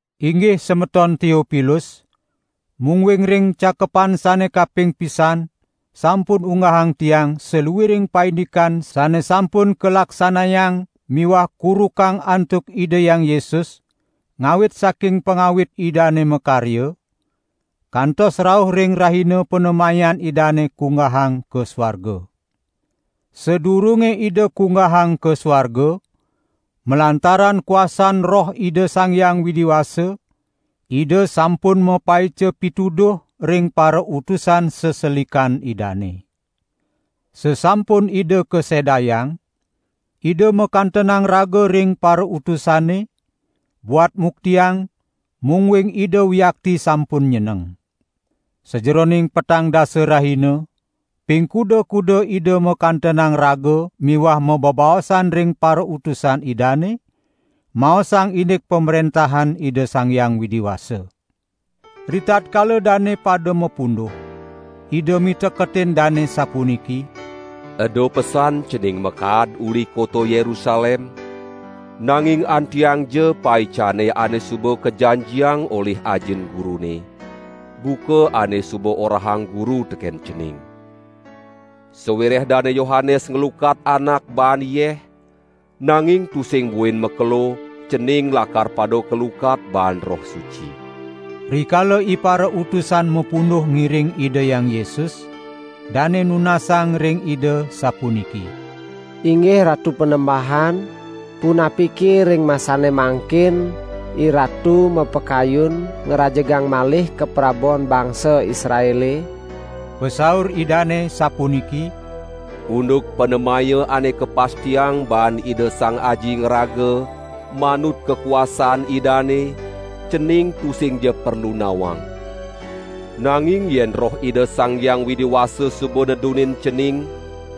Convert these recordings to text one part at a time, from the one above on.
Inggih semeton Teopilus, mungguing ring cakepan sane kaping pisan sampun unggahang tiang saluiring paindikan sane sampun kalaksanayang miwah kurukang antuk Ida Hyang Yesus, ngawit saking pangawit Idane makarya, kantos rauh ring rahina panemayan Idane kunggahang ka suarga. Sadurunge Ida kunggahang ka suarga, malantaran kuasan Roh Ida Sang Hyang Widi Wasa, Ida sampun mapaica pituduh ring parautusan seselikan Idane. Sasampun Ida kasedayang, Ida makantenang raga ring parautusane, buat muktiang mungguing Ida wiakti sampun nyeneng. Sajeroning petang dasa rahina, ping kuda-kuda Ida makantenang raga miwah mabebaosan ring parautusan Idane, maosang indik Pamrentahan Ida Sang Hyang Widi Wasa. Ritatkala dane pada mapunduh, Ida miteketin dane sapuniki: "Eda pesan cening makaad uli kota Yerusalem, nanging antiangja paicane ane suba kajanjiang olih Ajin Gurune, buka ane suba orahang Guru teken cening. Sawireh Dane Yohanes nglukat anak baan yeh, nanging tusing buin makelo, cening lakar pada kalukat baan Roh Suci." Rikala iparautusan mapunduh ngiring Ida Hyang Yesus, dane nunasang ring Ida, sapuniki: "Inggih Ratu Panembahan, punapika ring masane mangkin IRatu mapakayun ngrajegang malih kaprabon bangsa Israele?" Pasaur Idane sapuniki: "Unduk panemaya ane kapastiang baan Ida Sang Aji ngraga, manut kakuasan Idane, cening tusingja perlu nawang. Nanging yen Roh Ida Sang Hyang Widi Wasa suba nedunin cening,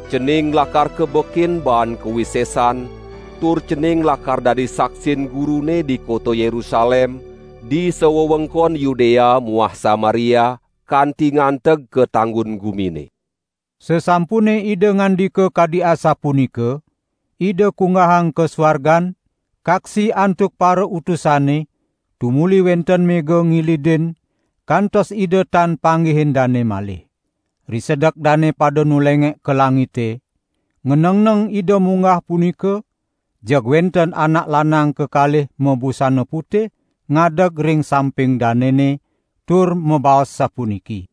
cening lakar kabekin baan kawisesan, tur cening lakar dadi saksin Gurune di kota Yerusalem, di sawewengkon Yudea muah Samaria, kanti nganteg ka tanggun gumine." Sasampune Ida ngandika kadi asapunika, Ida kunggahang ka suargan, kaksi antuk parautusane, tumuli wenten mega ngilidin kantos Ida tan panggihin dane malih. Risedek dane pada nulengek ka langite, nganengneng Ida munggah punika, jeg wenten anak lanang kekalih mabusana putih, ngadeg ring samping danene; tur mabaos sapuniki: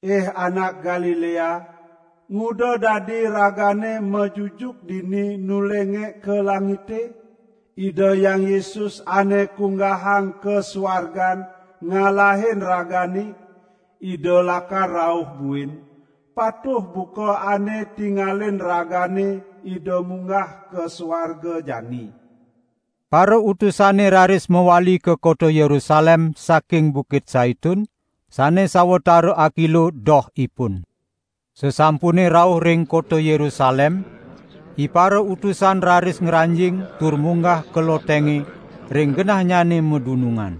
"Ih anak Galilea, nguda dadi ragane majujuk dini nulengek ka langite? Ida Hyang Yesus ane kunggahang ka suargan ngalahin ragane, Ida lakar rauh buin, patuh buka ane tingalin ragane Ida munggah ka suarga jani." Parautusane raris mawali ka kota Yerusalem saking Bukit Saitun, sane sawatara akilo dohipun. Sasampune rauh ring kota Yerusalem, iparautusan raris ngranjing tur munggah ka lotenge ring genahnyane madunungan.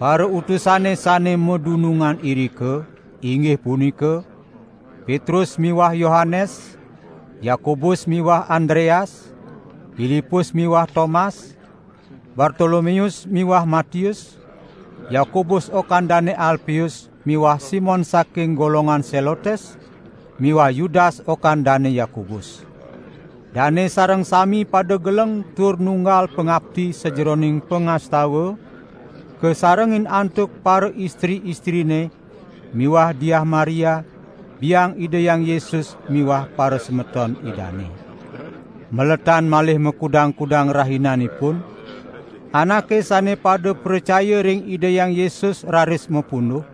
Parautusane sane madunungan irika, inggih punika: Petrus miwah Yohanes, Yakobus miwah Andreas, Pilipus miwah Tomas, Bartolomeus miwah Matius, Yakobus okan Dane Alpeus miwah Simon saking golongan Selotes miwah Yudas okan Dane Yakobus. Dane sareng sami pada geleng tur nunggal pangapti sajeroning pangastawan, kasarengin antuk paraistri-istrine miwah Diah Maria, biang Ida Hyang Yesus miwah parasemeton Idane. Maletan malih makudang-kudang rahinanipun, anake sane pada pracaya ring Ida Hyang Yesus raris mapunduh,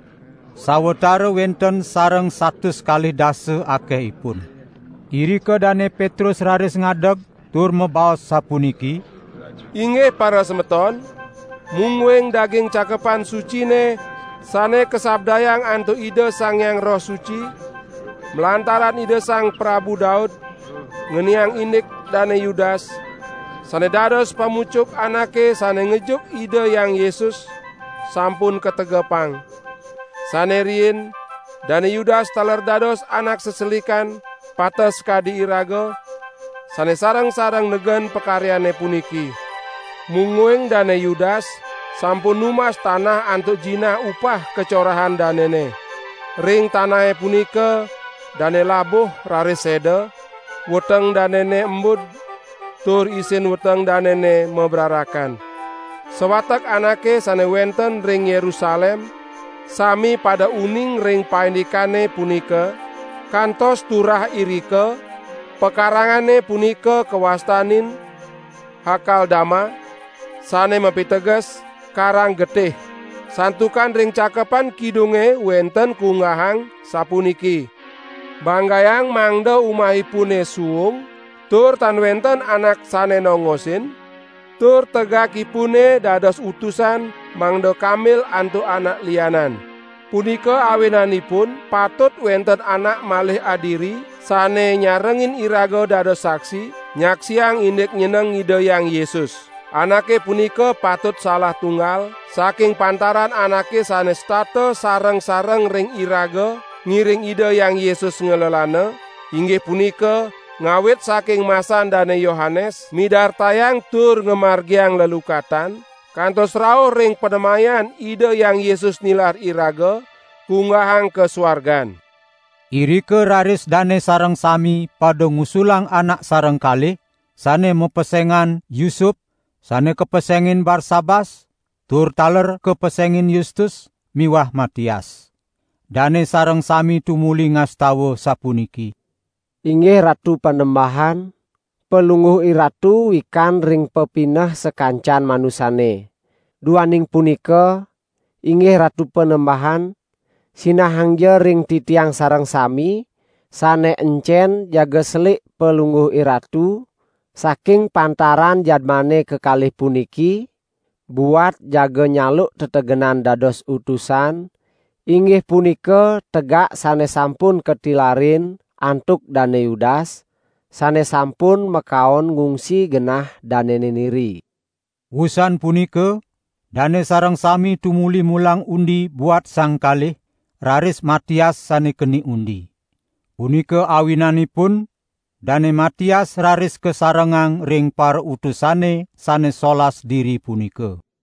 sawatara wenten sareng satus kalih dasa akehipun. Irika Dane Petrus raris ngadeg tur mabaos sapuniki: "Inggih parasemeton, mungguing daging Cakepan Sucine sane kasabdayang antuk Ida Sang Hyang Roh Suci malantaran Ida Sang Prabu Daud, ngeniang indik Dane Yudas, sane dados pamucuk anake sane ngejuk Ida Hyang Yesus, sampun kategepang. Sane riin Dane Yudas taler dados anak seselikan pateh sakadi iraga, sane sareng-sareng negen pakaryane puniki." ( Mungguing Dane Yudas sampun numbas tanah antuk jinah upah kacorahan danene. Ring tanahe punika dane labuh raris seda, weteng danene embud, tur isin weteng danene mabrarakan. Sawatek anake sane wenten ring Yerusalem sami pada uning ring paindikane punika, kantos turah irika pakarangane punika kawastanin: "Hakal Dama", sane mapiteges: "Karang Getih".) "Santukan ring Cakepan Kidunge wenten kunggahang, sapuniki: Banggayang mangda umahipune suung, tur tan wenten anak sane nongosin, tur tegakipune dados utusan mangda kambil antuk anak lianan.' Punika awinanipun patut wenten anak malih adiri sane nyarengin iraga dados saksi, nyaksiang indik nyeneng Ida Hyang Yesus. Anake punika patut salah tunggal saking pantaran anake sane setata sareng-sareng ring iraga ngiring Ida Hyang Yesus nglelana, inggih punika ngawit saking masan Dane Yohanes midartayang tur ngamargiang lelukatan, kantos rauh ring panemayan Ida Hyang Yesus nilar iraga kunggahang ka suargan." Irika raris dane sareng sami pada ngusulang anak sareng kalih, sane mapesengan: Yusup, sane kapesengin Barsabas (tur taler kapesengin Yustus) miwah Matias. Dane sareng sami tumuli ngastawa sapuniki: "Inggih Ratu Panembahan, Palungguh IRatu wikan ring pepineh sakancan manusane. Duaning punika, inggih Ratu Panembahan, sinahangja ring titiang sareng sami, sane encen jaga selik Palungguh IRatu saking pantaran jadmane kekalih puniki, buat jaga nyaluk tetegenan dados utusan, inggih punika tegak sane sampun katilarin antuk Dane Yudas, sane sampun makaon ngungsi genah danene niri." Wusan punika dane sareng sami tumuli mulang undi buat sang kalih, raris Matias sane keni undi. Punika awinanipun Dane Matias raris kasarengang ring parautusane sane solas diri punika.